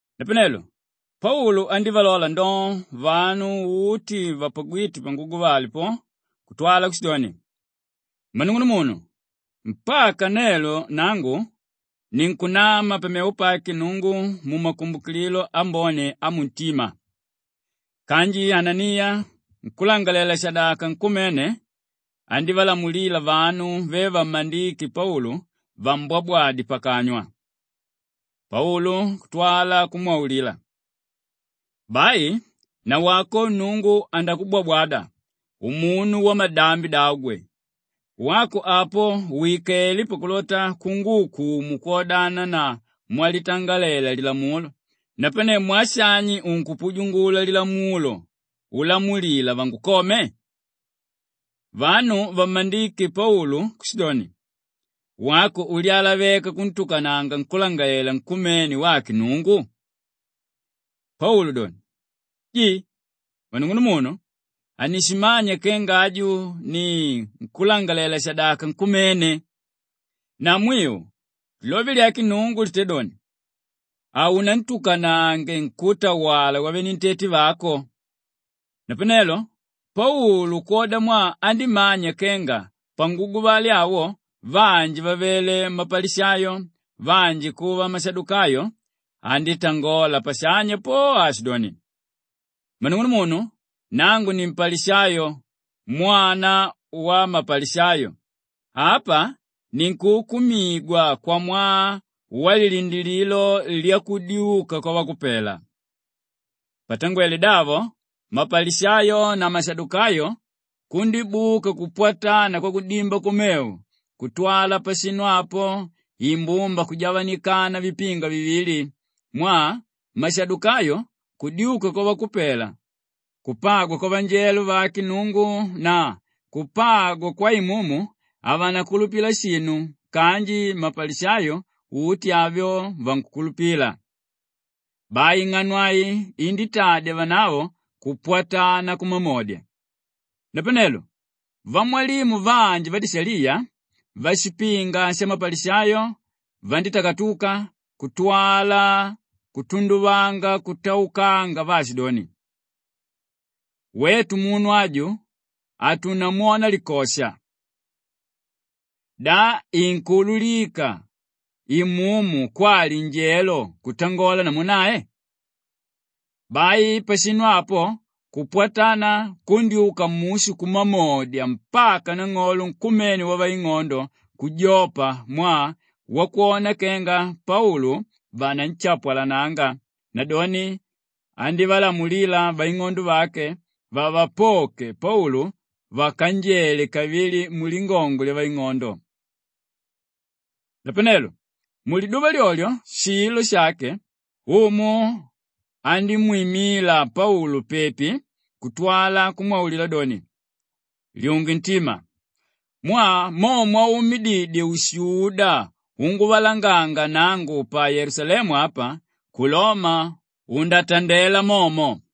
Napanelo Paulu andívalola ndoo vanu uti vapagwíte panguguvale po kutwala kushidoni, “Mmanung'unumunu, mpaka nelo nangu ninkunama pamevo pake Nnungu mumakumbukililo ambone amuntima.” Kanji Ananiya nkúlangalalela-shadaka nkumene andívalamulila vanu ve vammandíke Paulu vambwabwade pakanywa. Paulu kutwala kumwaulila, “Bai nawako Nnungu andakubwabwada umunu wamalambi davo gwe! Wako apo wikelé pakulota unguukumu kwodana na mwalitangalela Lilamulo, napane mwaa shani unkupujungula Lilamulo ulamulila vangukome?” Vanu vammandíke Paulu kushidoni, “Wako ulyalaveka kuntukananga nkúlangalalela nkumene wake Nnungu?” Paulu doni, “Ji, mmanung'unumunu, hanishimanya kenga aju ni nkúlangalalela-shadaka nkumene! Na mwiu, lilove lya Nnungu litédoni, ‘Haunantukanange nkútawala wavenentete vako.’” Napanelo Paulu kwodamwaa andímanya kenga panguguvale awo vanji vavele mapalishayo, vanji kuva mashadukayo, andítangola pashanya po aashidoni, “Mmanung'unumunu, nangu ni mpalishayo mwana wamapalishayo. Apa ninkuukumigwa kwamwaa walilindilililo lyakudyuka kwavakupela.” Mushigalegu: …kwamwaa walilindilililo na kudyuka kwavakupela. Patangwele davo, mapalishayo na mashadukayo kundíbuka kupwatana kwakudimba kumevo kutwala pashinu apo imbumba kujavanikana vipinga vivili mwaa mashadukayo kudyuka kwavakupela, kupagwa kwavanjelo vake Nnungu na kupagwa kwaimumu, havanakulupila shinu kanji mapalishayo uti avyo vankukulupila. Bai ing'ano ai indítadya vanavo kupwatana kumamodya. Napanelo vamwalimu vanji vadishaliya, vashipinga shamapalishayo vandítakatuka kutwala kutunduvanga kutaukanga vaashidoni, “Wetu munu aju hatunamwona likosha. Da inkuululika imumu kwali njelo kutangola namu nae?” Bai pashinu apo kupwatana kundyúka mushu kumamodya mpaka nang'olo nkumene wavaing'ondo kujopa mwaa wakwona kenga Paulu vananshapwalananga; nadoni andívalamulila vaing'ondo vake vavapoke Paulu vakanjele kavili mulingongo lyavaing'ondo. Napanelo muliduva lyolyo shilo shake, Umu andímwimila Paulu pepi kutwala kumwaulila doni, “Lyunge ntima! Mwaa mo mwaumididye ushuda unguvalanganga nangu pa Yelusalemu apa, ku Loma undatandela momo.”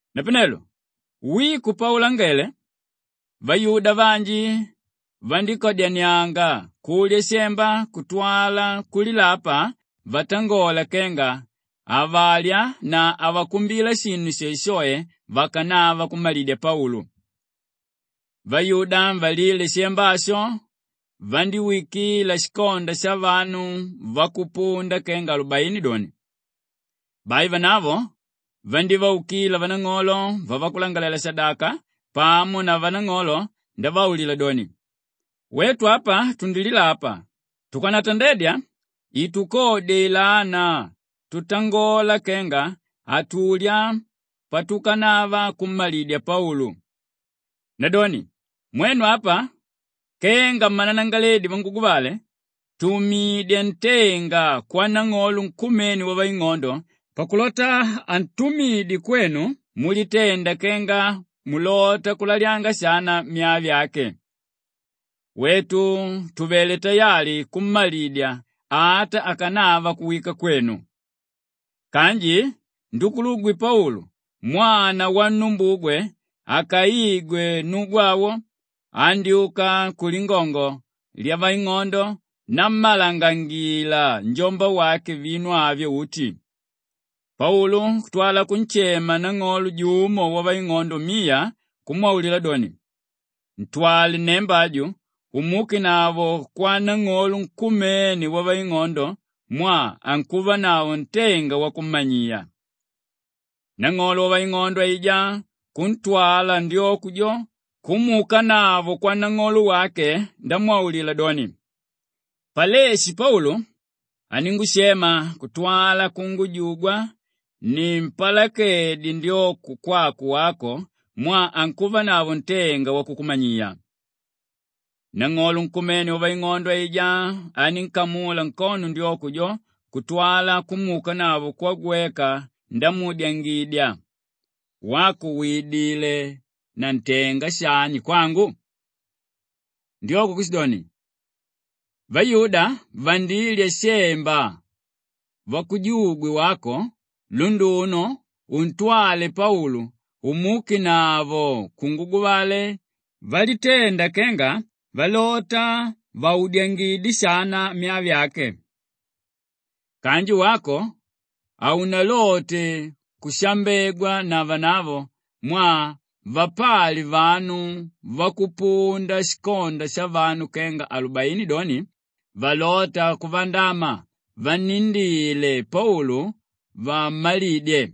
Napanelo wiko paulangele, vayuda vanji vandíkadyanianga kulya shemba kutwala kulilapa vatangola kenga havalya na havakumbila shinu shoeshoe vakanava kummalidya Paulu. Vayuda valíle shemba asho vandíwikila shikonda shavanu vakupunda kenga alubaini doni. Bai vanavo vandívaukila vanang'olo vavakulangalalela-shadaka pamo na vanang'olo ndavaulila doni, “Wetu apa tundililapa tukanatandedya itukodye ilana tutangola kenga hatulya patukanava kummalidya Paulu. Nadoni mwenu apa kenga mmananangalaledi vanguguvale, tumidya ntenga kwanang'olo nkumene wavaing'ondo pakulota antumidye kwenu mulitenda kenga mulota kulalyanga shana myaa vyake. Wetu tuvelé tayali kummalidya ata akanava kuwika kwenu.” Kanji ndukulugwe Paulu mwana wannumbugwe akaigwe nnugu awo, andyúka kulingongo lyavaing'ondo nammalangangila njombawake vinu avyo uti. Paulu kutwala kunshema nang'olo jumo wavaing'ondo miya kumwaulila doni, “Ntwale nnemba aju umuukenavo kwanang'olo nkumene wavaing'ondo mwaa ankuvanavo ntenga wakummanyiya.” Nang'olo wavaing'ondo aijá kuntwala ndyoko jo kumuukanavo kwanang'olo wake ndamwaulila doni, “Paleshi Paulu aníngushema kutwala kungujugwa nimpalakedye ndyoko kwako wako mwaa ankuvanavo ntenga wakukumanyiya.” Nang'olo nkumene wavaing'ondo aijá anínkamula nkono ndyoko jo kutwala kumuukanavo kwagweka ndamuudyangidya, “Wako widilé na ntenga shani kwangu?” Ndyoko kushidoni, “Vayuda vandilya shemba vakujugwe wako lunduno untwale Paulu umuukenavo kunguguvale valitenda kenga valota vaudyangidye shana myaa vyake. Kanji wako haunalote kushambegwa na vanavo mwaa vapali vanu vakupunda shikonda shavanu kenga alubaini doni, valóta kuvandama vannindile Paulu vammalidye.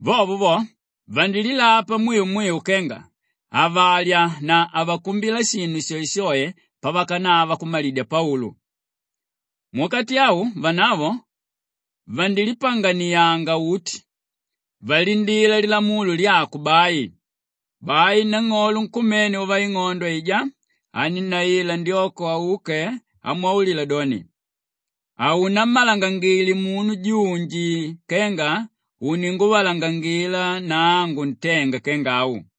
Vovo vo vandililapa mwiu mwiu kenga havalya na havakumbila shinu shoeshoe pavakanava kummalidya Paulu. Muwakati au vanavo vandilipanganianga uti valindila lilamulo lyako bai.” Bai nang'olo nkumene wavaing'ondo aijá anínnaila ndyoko auke amwaulila doni, “Haunammalangangile munu junji kenga uninguvalangangila nangu ntenga kenga au.”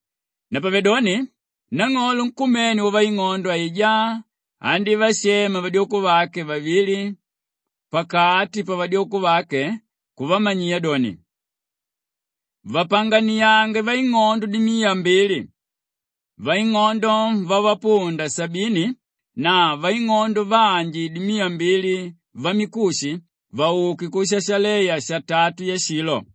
Napavedoni nang'olo nkumene wavaing'ondo aijá andívashema vadyoko vake vavili pakati pavadyoko vake kuvamanyiya doni, “Vapanganiange vaing'ondo dimiya mbili, vaing'ondo vavapunda sabini na vaing'ondo vanji dimiya mbili vamikushi vauke ku Shashaleya satatu yashilo.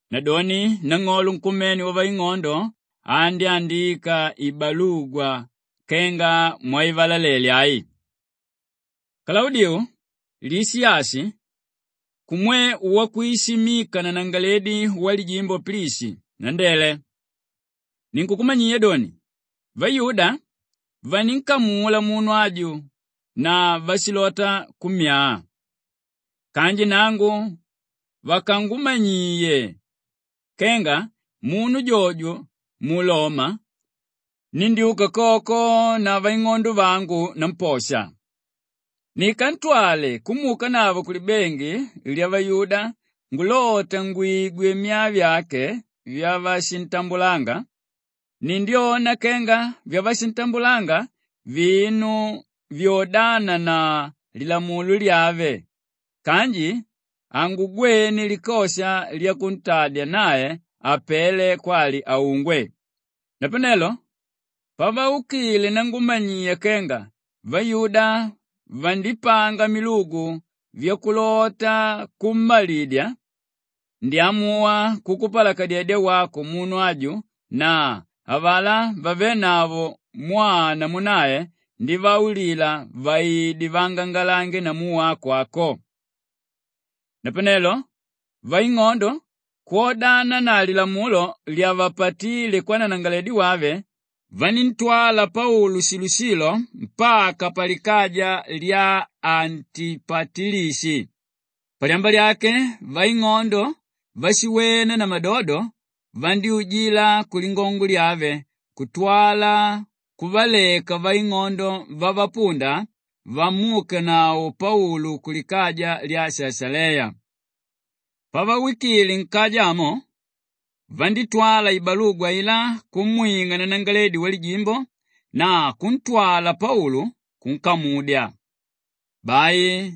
Nadoni nang'olo nkumene wavaing'ondo andyándika ibalugwa kenga mwaivalalele ai: “Kalaudiu Lishiyashi kumwe wakwishimika nanangalaledi wamajimbo Pilishi, nandele. Ninkukumanyiya doni, vayuda vanínkamula munu aju na vashilota kummyaa. Kanji nangu vakangumanyiye kenga munu jojo muloma, nindyúka koko na vaing'ondo vangu namposha. Nikantwale kumuukanavo kulibengi lyavayuda ngulota ngwigwe myaa vyake vyavashintambulanga, nindyona kenga vashintambulanga vinu vyodana na lilamulo lyave kanji hangugwene likosha lyakuntadya nae apele kwali aungwe. Napanelo pavaukile nangumanyiya kenga vayuda vandipanga milugu vyakulota kummalidya, ndyamuwa kukupalakadyedya wako munu aju na avalá vavénavo mwaa namu nae ndivaulila vaide vaangangalange namu wako ako.” Napanelo vaing'ondo kwodana na lilamulo lyavapatile kwananangalaledi wave, vaníntwala Paulu shilo-shilo mpaka palikaja lya Antipatilishi. Palyamba lyake vaing'ondo váshiwena na madodo vandyújila kulingongo lyave kutwala kuvaleka vaing'ondo vavapunda vamuukanavo Paulu kulikaja lya Shashaleya. Pavawikile nkaja amo vandítwala ibalugwa ailá kumwing'a nanangalaledi wamajimbo na kuntwala Paulu kunkamudya. Bai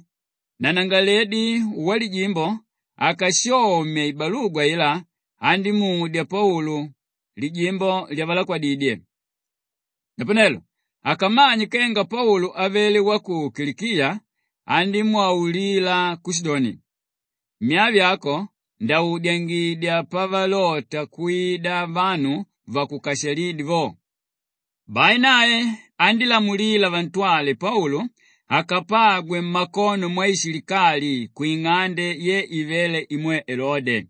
nanangalaledi wamajimbo akashomye ibalugwa ailá andímudya Paulu lijimbo lyavalakwadidye. Napanelo akamanye kenga Paulu avele wa ku Kilikiya, andímwaulila kushidoni, “Myaa vyako ndaudyangidya pavalota kwida vanu vakukashalídye vo.” Bai nae andílamulila vantwale Paulu akapagwe mmakono mwaishilikali kwing'ande ye ivéle imwe Elode.